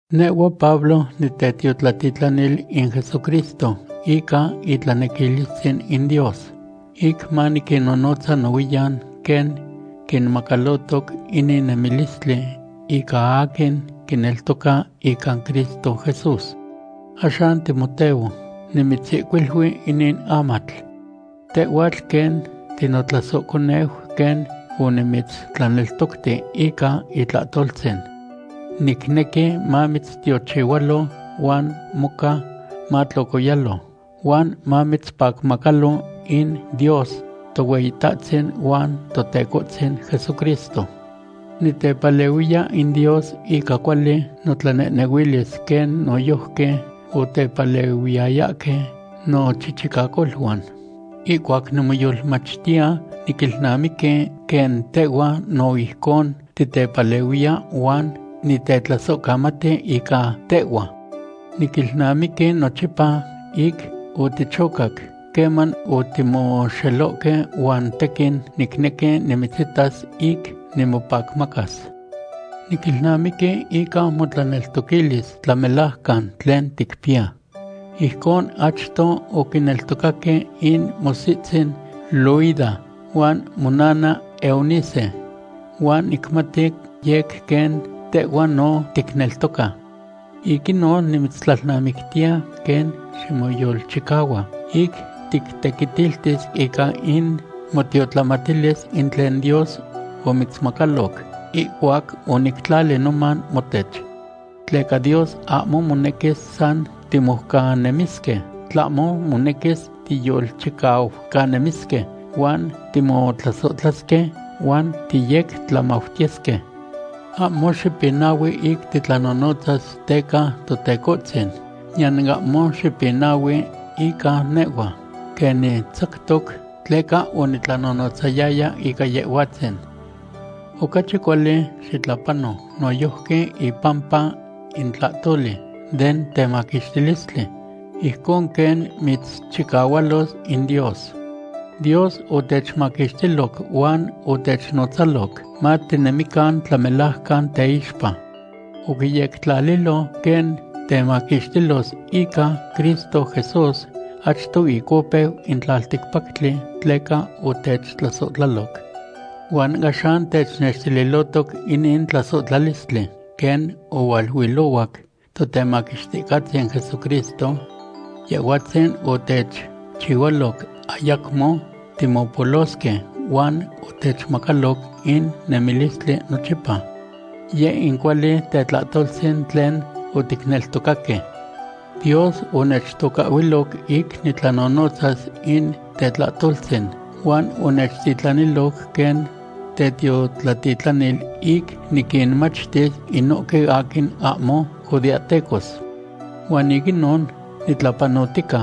Nehhua Pablo, nitetiotlatitlanil in Jesucristo ica itlanequilistzin in Dios, ic maniquinnonotza nohuiyan quen quinmacalohtoc inin nemilistli ica aquin quineltoca ica Cristo Jesús. Axan Timoteo, nimitzihcuili inin amatl. Tehhuatl quen tinotlasohconeu quen onimitztlaneltocti ica itlahtoltzin. Nicnequi mamitztiochihualo huan moca matlocoyalo huan mamitzpacmacalo in Dios Tohueyitahtzin huan Totecohtzin Jesucristo. Nitepalehuiya in Dios ica cuali notlanehnehuilis quen noyojqui otepalehuiyayahque nochichicacoluan. Ihcuac nimoyolmachtiya, niquilnamiqui quen tehhua no ijcon titepalehuiya huan nitetlasohcamati ica tehhua. Niquilnamiqui nochipa ic otichocac queman otimoxelohque huan tequin nicnequi nimitzitas ic nimopacmacas. Niquilnamiqui ica motlaneltoquilis tlamelajcan tlen ticpiya. Ijcon achto oquineltocaque in motzitzin Loida huan monana Eunice, huan nicmati yec quen tehhua no ticneltoca. Ic inon, nimitztlalnamictiya quen ximoyolchicahua ic tictequitiltis ica in motiotlamatilis in tlen Dios omitzmacaloc ihcuac onictlali noman motech. Tleca Dios ahmo monequis san timoucanemisque, tlahmo monequis tiyolchicaucanemisque huan timotlasohtlasque huan tiyectlamautiyesque. Ahmo xipinahui ic titlanonotzas teca Totecohtzin, niyan ahmo xipinahui ica nehhua, quen nitzactoc tleca onitlanonotzayaya ica Yehhuatzin. Ocachi cuali xitlapano noyojqui ipampa in tlahtoli den temaquixtilistli, ijcon quen mitzchicahualos in Dios. Dios otechmaquixtiloc huan otechnotzaloc matinemican tlamelajcan teixpa. Oquiyectlalilo quen techmaquixtilos ica Cristo Jesús achto ic opeu in tlalticpactli tleca otechtlasohtlaloc. Huan axan technextililohtoc inin tetlasohtlalis quen ohualuilohuac Totemaquixticahtzin Jesucristo. Yehhuatzin otechchihualoc ayacmo timopolosque huan otechmacaloc in nemilistli nochipa. Yeh in cuali tlahtoltzin tlen oticneltocaque. Dios onechtocahhuiloc ic niquinnonotzas in tetlahtoltzin huan onechtitlaniloc quen tetiotlatitlanil ic niquinmachtis inohque aquin ahmo judeahtecos. Huan ic inon nitlapanohtica.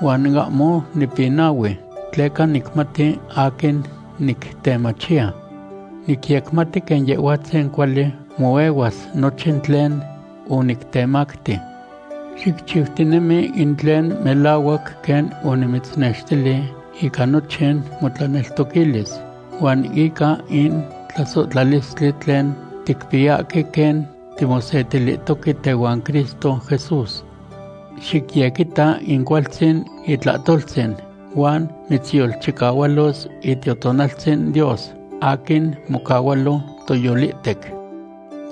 Huan ahmo nipinahui, tleca nicmati aquin nictemachiya. Nicyecmati quen Yehhuatzin cuali moehuas nochin tlen onictemacti. Xicchiutinemi in tlen melahuac quen onimitznextili ica nochin motlaneltoquilis huan ica in tlasohtlalistli tlen ticpiyahque quen timosetilihtoque tehuan Cristo Jesús. Xicyequita in cualtzin itlahtoltzin huan mitzyolchicahualos Itiotonaltzin Dios aquin mocahualo toyolihtec.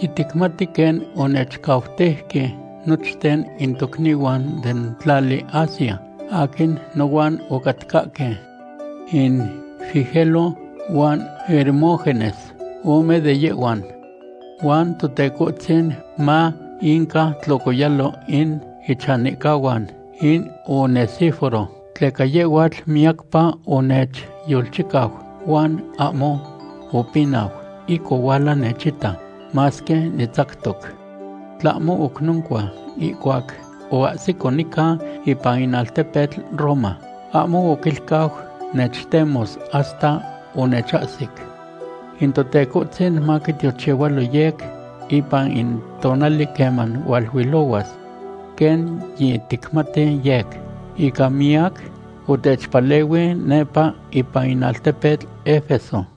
Yiticmati quen onechcauteuque nochten in tocnihuan den tlali Asia aquin nohuan ocatcahque. In Figelo huan Hermógenes ome de yehhuan. Huan Totecohtzin ma inca tlocoyalo in ichanihcahuan in Onesíforo, tleca yehhuatl miyacpa onechyolchicau huan ahmo opinau ic ohuala nechita, masque nitzactoc. Tlahmo oc noncua, ihcuac oahsito nica ipan in altepetl Roma, ahmo oquilcau nechtemos hasta onechahsic. In Totecohtzin maquitiochihualo yec ipan in tonali queman hualuilohuas. Quen yiticmati yec, ica miyac otechpalehui nepa ipan in altepetl Efeso.